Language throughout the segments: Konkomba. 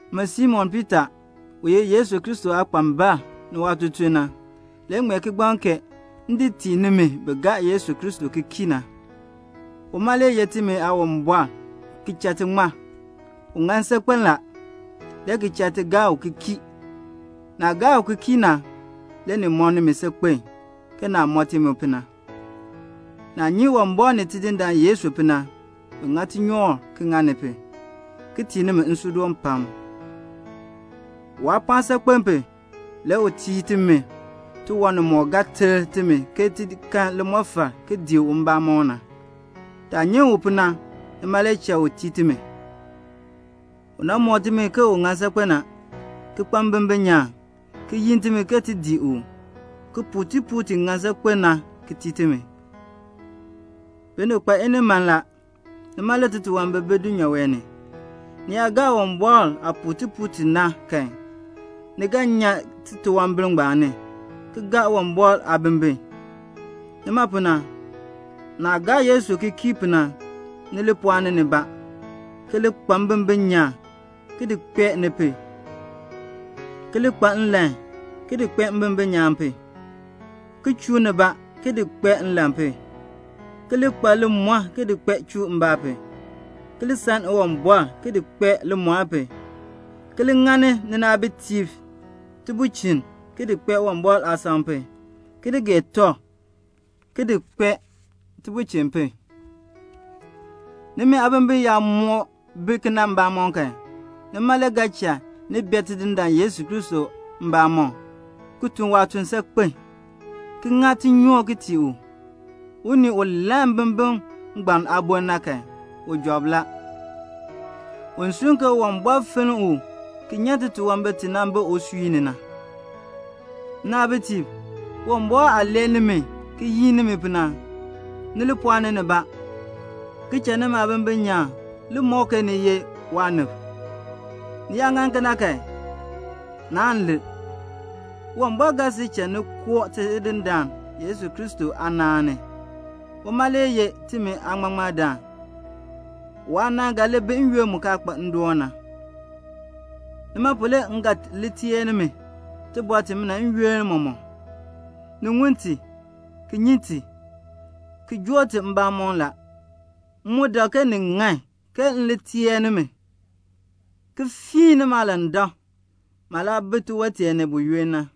Min Simon Piita u ye Yesu Kristo aakpambal ni waatutuln na, m ŋmee kigbaŋ kee m di tii nimi bi gaa Yesu Kristo ki kii na. Uma le ye timi Aawumbɔr ki cha ti ŋmar. U ŋan saakpen la, le ki cha ni gaa u ki kii. Naah gaa u ki kii na, le ni mɔ nimi saakpen, ke naah mɔ ti mu pu na. Naah nyi Uwumbɔr ni Tidindaan Yesu pu na, bin ŋa tinyoor ki ŋa ni pu ki tii nimi nsuudoon pam. Waapɔɔn saakpen pu, le u tii timi tiwan nimɔk ga ter timi ke ti kan limɔfal ki dii u mbamɔn na. Taah nyi u pu na, nima le cha u tii timi. U nan mɔk timi ke u ŋan saakpen a, ki kpa mbimbin nyaan, ki yin timi ke ti dii u, ki puu tipuul ti ŋan saakpen na ki tii timi. Binib kpa iniman la. Nima le titunwambir bi dulnyaa wee ni. Ni yaa gaa Uwumbɔr aah puu tipuul ti na kan, ni ga nyan titunwambir ngbaan ni, ki gaa Uwumbɔr aabimbin. Nima pu na, naah gaa Yesu ki kii pu na, ni li pɔɔni nibaa ki li kpa mbimbin nyaan, ki di kpee ni pu; ki li kpa nlan ki di kpee mbimbin nyaan pu; ki chuu nibaa ki di kpee nlan pu; ki li kpa limɔr ki di kpee chuumbaa pu; ki li san Uwumbɔr ki di kpee limɔr pu; ki li ŋani ninaabitiib tibulchin ki di kpee Uwumbɔr aasam pu; ki li gee tɔb, ki di kpee tibulchin pu. Nimi aabimbin yaa moo bi kena mbamɔm kan, nima le ga cha ni bee Tidindaan Yesu Kristo mbamɔm, ki tun waatuln saakpen, ki ŋa tinyoor tii u. Unii u lann mbimbin ngbaan aaboln na kan, u job la. U sunn ke Uwumbɔr nan finn u ki nyan titunwambir ti nan bi usui ni na. Nnaabitiib, Uwumbɔr aah lee nimi ki yin nimi pu na, ni li pɔɔni nibaa ki cha nimi aabimbin nyaan li mɔk ke ni sil ye waanib. Ni yaa ŋa kena kan, naan lir. Uwumbɔr ga sil cha ni koo Tidindaan Yesu Kristo aanaan ni. Uma le ye timi Aaŋmaŋmardaan. Waanaan ga li bi n-yoonn mu kaa kpa ndoon na. Nima pu le m ga teer nimi tibɔr timina n-yoonn mɔmɔk. Ni ŋun ti, ki nyi ti, ki joo ti mbamɔm la. M mu dak ke ni ŋan ke m teer nimi, ki fiin nimi aalandak, maah laa bi tiwon tee ni na.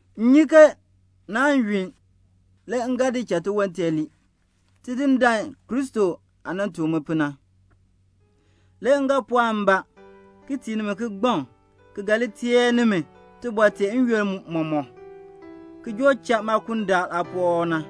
M nyi ke naan yunn, le m ga di cha tiwon tee lii, Tidindaan Yesu Kristo aah nan tuk mi pu na. Le m ga pɔɔk mbaa ki tii nimi kigbaŋ ki ga li teer nimi tibɔr tee n-yoonn mɔmɔk, ki joo cha maakundaal aapuwɔb na.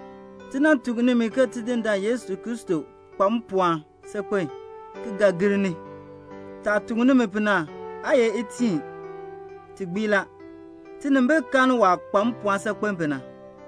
Ti nan tuk nimi ke Tidindaan Yesu Kristo kpa mpɔɔn saakpen ki ga ki gir ni. Taah tuk nimi pu na aa ye itiin. Ti gbii la. Tinimbil kan waah kpa mpɔɔn saakpen pu na.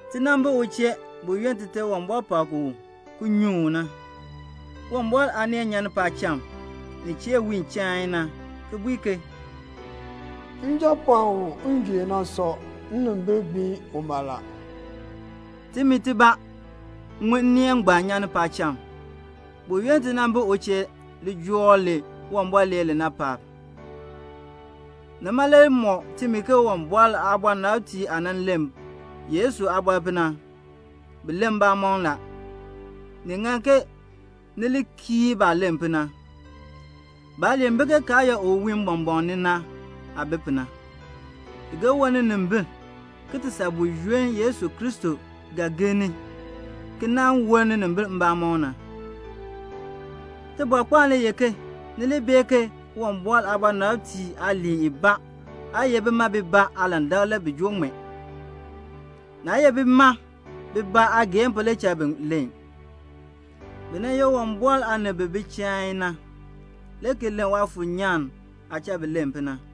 Ti nan bi u chee buyoonn Tite Uwumbɔr pak u ki nyuŋ u na. Uwumbɔr aaneel nyan paacham nin chee wiin chain na, ki bui ke "Njapɔɔn u m gee u na sɔ. Nnimbil gbiin uma la." Timi tibaa ŋun nneel ngbaan nyan ni paacham, buyoonn ti nan bi u chee lijool li Uwumbɔr lee li na paab. Nima le mɔk timi ke Uwumbɔr aabɔnabtiib aah nan len Yesu aabɔr pu na, bi len mbamɔn la. Ni ŋan ke ni li kii baah len pu na. Baaliin bi ke karyaa u wiin mbɔmbɔɔn ni na aah bi pu na. I ga woln ninimbil ki ti saa buyoonn Yesu Kristo ga gir ni ki nan woln ninimbil mbamɔm na. Tibɔrkpaan le ye ke ni li bee ke Uwumbɔr aabɔnabtiib aaliin ibaa aa ye bima bibaa aalandak le bi joo ŋmee. Naa ye bima bibaa aageehn pu le cha bi len. Bi nan ye Uwumbɔr aanib bi bi chain na, le ki len Waafuur nyaan aah cha bi len pu na.